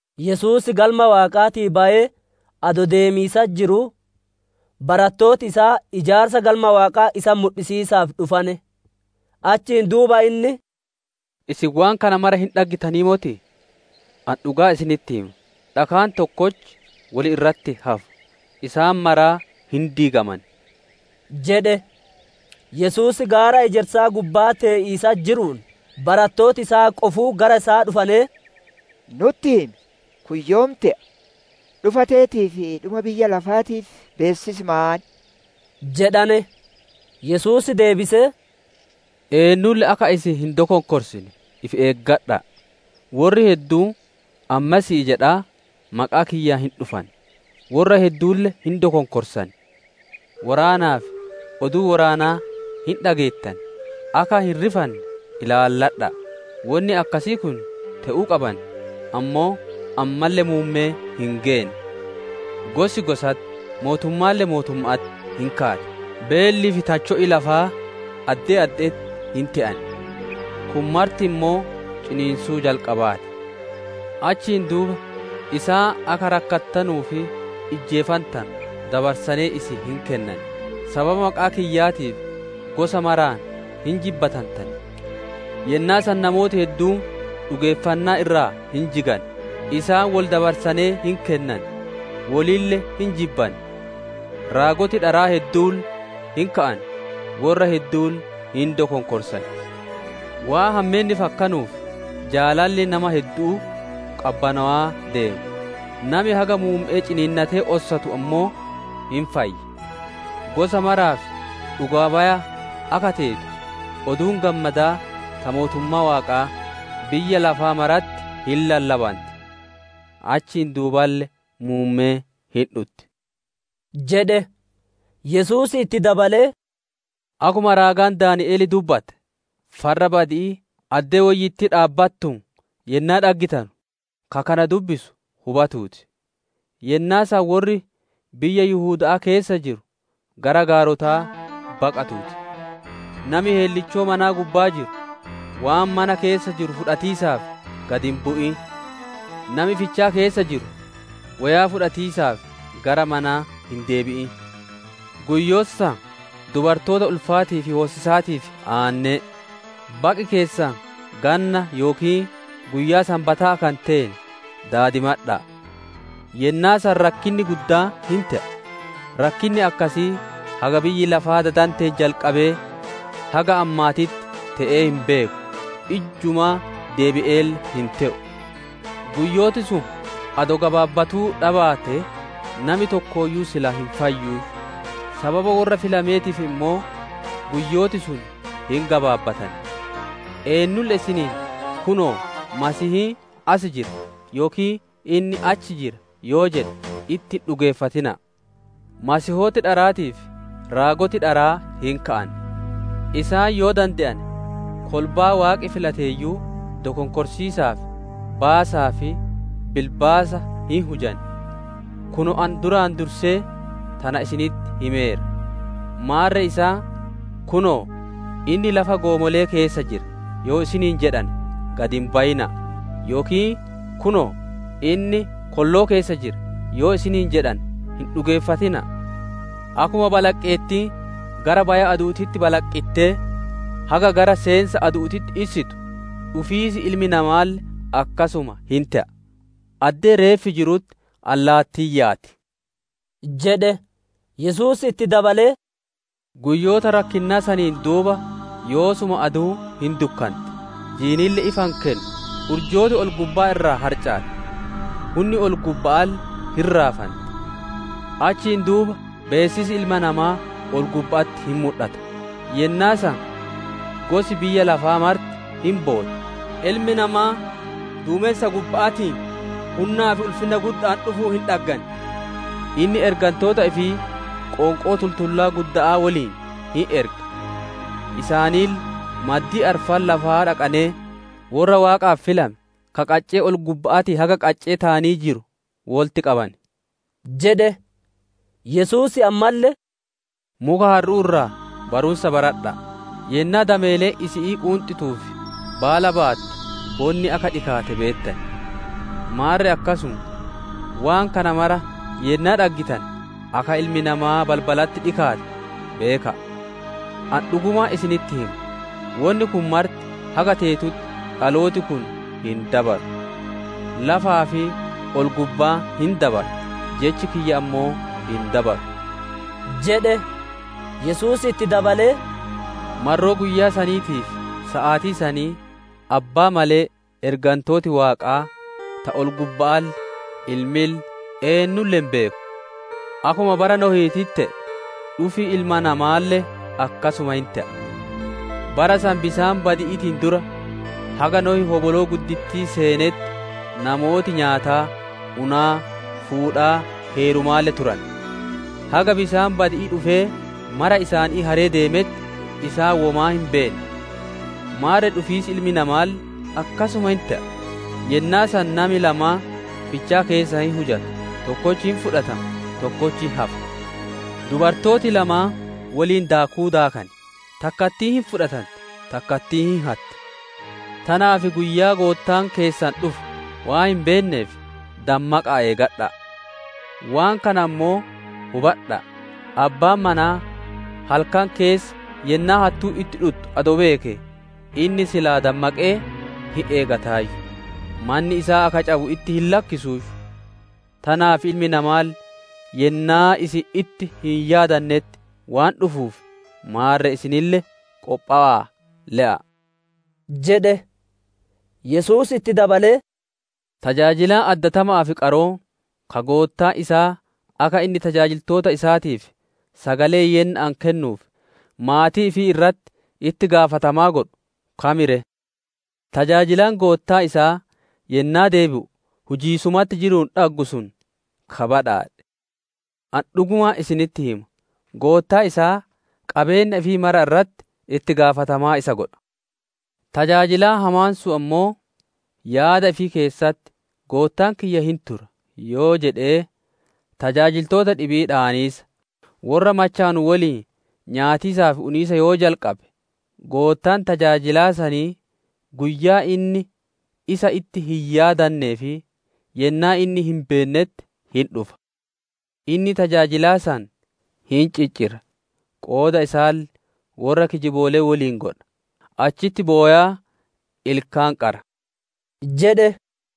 Yesuus Galma Waaqaatii bayee adoo deemiisatti jiruu, barattooti isaa ijaarsa Galma Waaqaa isatti mudhisiisaaf dhufane. Achiin duuba inni, «Isin waan kana mara hin dhaggitanii motii? Ani dhugaa isinitti hima, dhakaan tokkochi wol irratti hin hafu; isaan maraa hin diigaman» jedhe. Yesuus gaara ejersaa gubbaa tee'iisatti jiruun, barattooti isaa qofuu gara isaa dhufanee, «Nutti himi, kun yoom te'a, dhufa teetii fi dhuma biyyaa lafaatiif beessisi maan?» jedhane. Yesuus deebisee, «Eennulle akka isin hin dokonkorsine ifi eeggadha'a! Worri hedduun, ‹Ani Masiihii› jedhaa maqaa kiyyaan hin dhufan. Worra hedduulle hin dokonkorsan. Woraanaa fi oduu woraanaa hin dhageettan; akka hin rifanne ilaalladha'a; wonni akkasii kun te'uu qaban, ammoo ammalle muummeen hin geenne. Gosi gosatti, mootummaalle mootumma'atti hin kaati; beellii fi tacho'i lafaa addee adde'etti hin te'an. Kun marti ammoo ciniinsuu jalqabaa ti. «Achiin duuba isaan akka rakkattanuu fi ijjeefantanu dabarsanee isin hin kennan, sababa maqaa kiyyaatiif gosa maraan hin jibbatantan. Yennaa san namooti hedduun dhugeeffannaa irraa hin jigan, isaan wol dabarsanee hin kennan, wolille hin jibban. Raagoti dharaa hedduulle hin ka'an, worra hedduulle hin dokonkorsan. Waan hammeenni fakkanuuf, jaalalli nama heddu'uu qabbanowaa deema. Nami haga muumme'ee ciniinnatee ossatu ammoo hin fayya. Gosa maraaf dhugaa baya akka teetu, Oduun Gammadaa ta mootummaa Waaqaa, biyya lafaa maratti hin lallabanti. Achiin duuballe muummeen hin dhutti» jedhe. Yesuus itti dabalee, «Akkuma raagaan Daani'el dubbate, ‹Farra badi'ii› addee woyyittii dhaabbattuun yennaa dhaggitanu, ka kana dubbisu hubatuu ti! Yennaa san worri biyyaa Yihuda'aa keessa jiru gara gaarotaa baqatuu ti. Nami heellichoo manaa gubbaa jiru waan mana keessaa fudhatiisaaf gad hin bu'in. Nami fichaa keessa jiru woyaa fudhatiisaaf gara manaa hin deebi'in. Guyyoota san dubartoota ulfaatii fi hoosisaatiif aanne'e! Baqi keessan ganna yookiin guyyaa Sanbataa akka hin teene daadimadha'a! Yennaa san rakkinni guddaan hin te'a, rakkinni akkasii haga biyyi lafaa dadanteen jalqabee haga ammaatitti te'ee hin beeku, ijjumaa deebi'eelle hin te'u. Guyyooti sun adoo gabaabbatuu dhabaatee, nami tokkooyyuu silaa hin fayyuuyyu; sababa worra filameetiif ammoo guyyooti sun hin gabaabbatan. «Eennuulle isiniin ‹Kunoo! Masiihiin as jira!› yookiin, ‹Inni achi jira!› yoo jedhe itti hin dhugeeffatina'a. Masiihooti dharaatii fi raagoti dharaa hin ka'an; isaan yoo dande'ane, kolbaa Waaqi filateeyyuu, dokonkorsiisaaf baasaa fi bilbaasa hin hujan. Kunoo ani duraan dursee tana isinitti himeera. Maarre isaan, ‹Kunoo! Inni lafa goomole'ee keessa jira› yoo isiniin jedhane gad hin bayina'a; yookiin, ‹Kunoo! Inni kolloo keessa jira› yoo isiniin jedhane hin dhugeeffatina'a. Akkuma balaqqeettiin gara baya-adu'uutitti balaqqittee haga gara seensa-adu'uutitti issitu, dhufiis Ilma Namaalle akkasuma hin te'a. Addee reeffi jirutti allaattiin yaati» jedhe. Yesuus itti dabalee, «Guyyoota rakkinnaa saniin duuba yoosuma aduun hin dukkanootti, jiinille ifa ifii hin kennu; urjooti ol-gubbaa irraa harcaati, hunni ol-gubba'aalle hin raafanti. Achiin duuba beessisi Ilma Namaa ol-gubba'atti hin mudhata, yennaa san gosi biyya lafaa marti hin bootti; Ilmi Namaa duumensa gubba'aatiin hunnaa fi ulfinna gudda'aan dhufuun hin dhaggan. Inni ergantoota ifii qoonqoo tultullaa gudda'aa woliin hin erga. Isaanille maddii arfan lafaa dhaqanee, worra Waaqaaf filame ka qaccee ol-gubba'aatii haga qaccee taanii jiru wolitti qaban» jedhe. Yesuus ammalle, «Muka harru'uu irraa barumsa baradha'a! Yennaa dameeleen isi'ii quunxituu fi baala baattu, bonni akka dhikaate beettan. Maarre akkasuma, waan kana mara yennaa dhaggitane akka Ilmi Namaa balbalatti dhikaate beeka'a. Ani dhugumaan isinitti hima, wonni kun marti haga teetutti dhalooti kun hin dabaru. Lafaa fi ol-gubbaan hin dabaran, jechi kiyya ammoo hin dabaru» jedhe. Yesuus itti dabalee, «Marroo guyyaa saniitii fi saatii sanii Abbaa malee, ergantooti Waaqaa ta ol-gubba'aalle, Ilmille, eennulle hin beeku. Akkuma bara Nohiititti te'e, dhufi Ilma Namaalle akkasuma hin te'a. Bara san bisaan badi'iitiin dura, haga Nohi hoboloo guddittii seenetti, namooti nyaataa, unaa, fuudhaa, heerumaalle turane; haga bisaan badi'ii dhufee mara isaanii haree deemetti isaan womaa hin beenne. Maarre dhufiis Ilma Namaalle akkasuma hin te'a. Yennaa san nami lamaan fichaa keessa hin hujata; tokkochi hin fudhatama, tokkochi hin hafa. Dubartooti lamaan woliin daakuu daakan; takkattiin hin fudhatanti, takkattiin hin hatti. Tanaaf, guyyaa Goottaan keessan dhufu waan hin beenneef, dammaqa'aa eegadha'a. Waan kana ammoo hubadha'a: abbaan manaa halkan keessa yennaa hattuun itti dhuttu adoo beekee, inni silaa dammaqee hin eegataayyu, manni isaa akka cabu itti hin lakkisuuyyu. Tanaaf Ilmi Namaalle yennaa isin itti hin yaadanetti waan dhufuuf, maarre isinille qophowa'aa le'a'a» jedhe. Yesuus itti dabalee, «Tajaajilaan addatama'aa fi qaroon, ka goottaan isaa akka inni tajaajiltoota isaatiif sagalee yenna'aan kennuuf, maatii ifii irratti itti gaafatamaa godhu kam ree? Tajaajilaan goottaan isaa yennaa deebi'u hujiisumatti jiruun dhaggu sun ka badhaadhe. Ani dhugumaan isinitti hima, goottaan isaa qabeenna ifii mara irratti itti gaafatamaa isa godha. Tajaajilaan hamaan sun ammoo yaada ifii keessatti, ‹Goottaan kiyya hin tura› yoo jedhee, tajaajiltoota dhibii dhaaniisa, worra machowanu woliin nyaatiisaa fi uniisa yoo jalqabe, goottaan tajaajilaa sanii guyyaa inni isa itti hin yaadanee fi yennaa inni hin beennetti hin dhufa. Inni tajaajilaa san hin ciccira qooda isaalle worra kijiboolee woliin godha, achitti bowaa ilkaan qara» jedhe.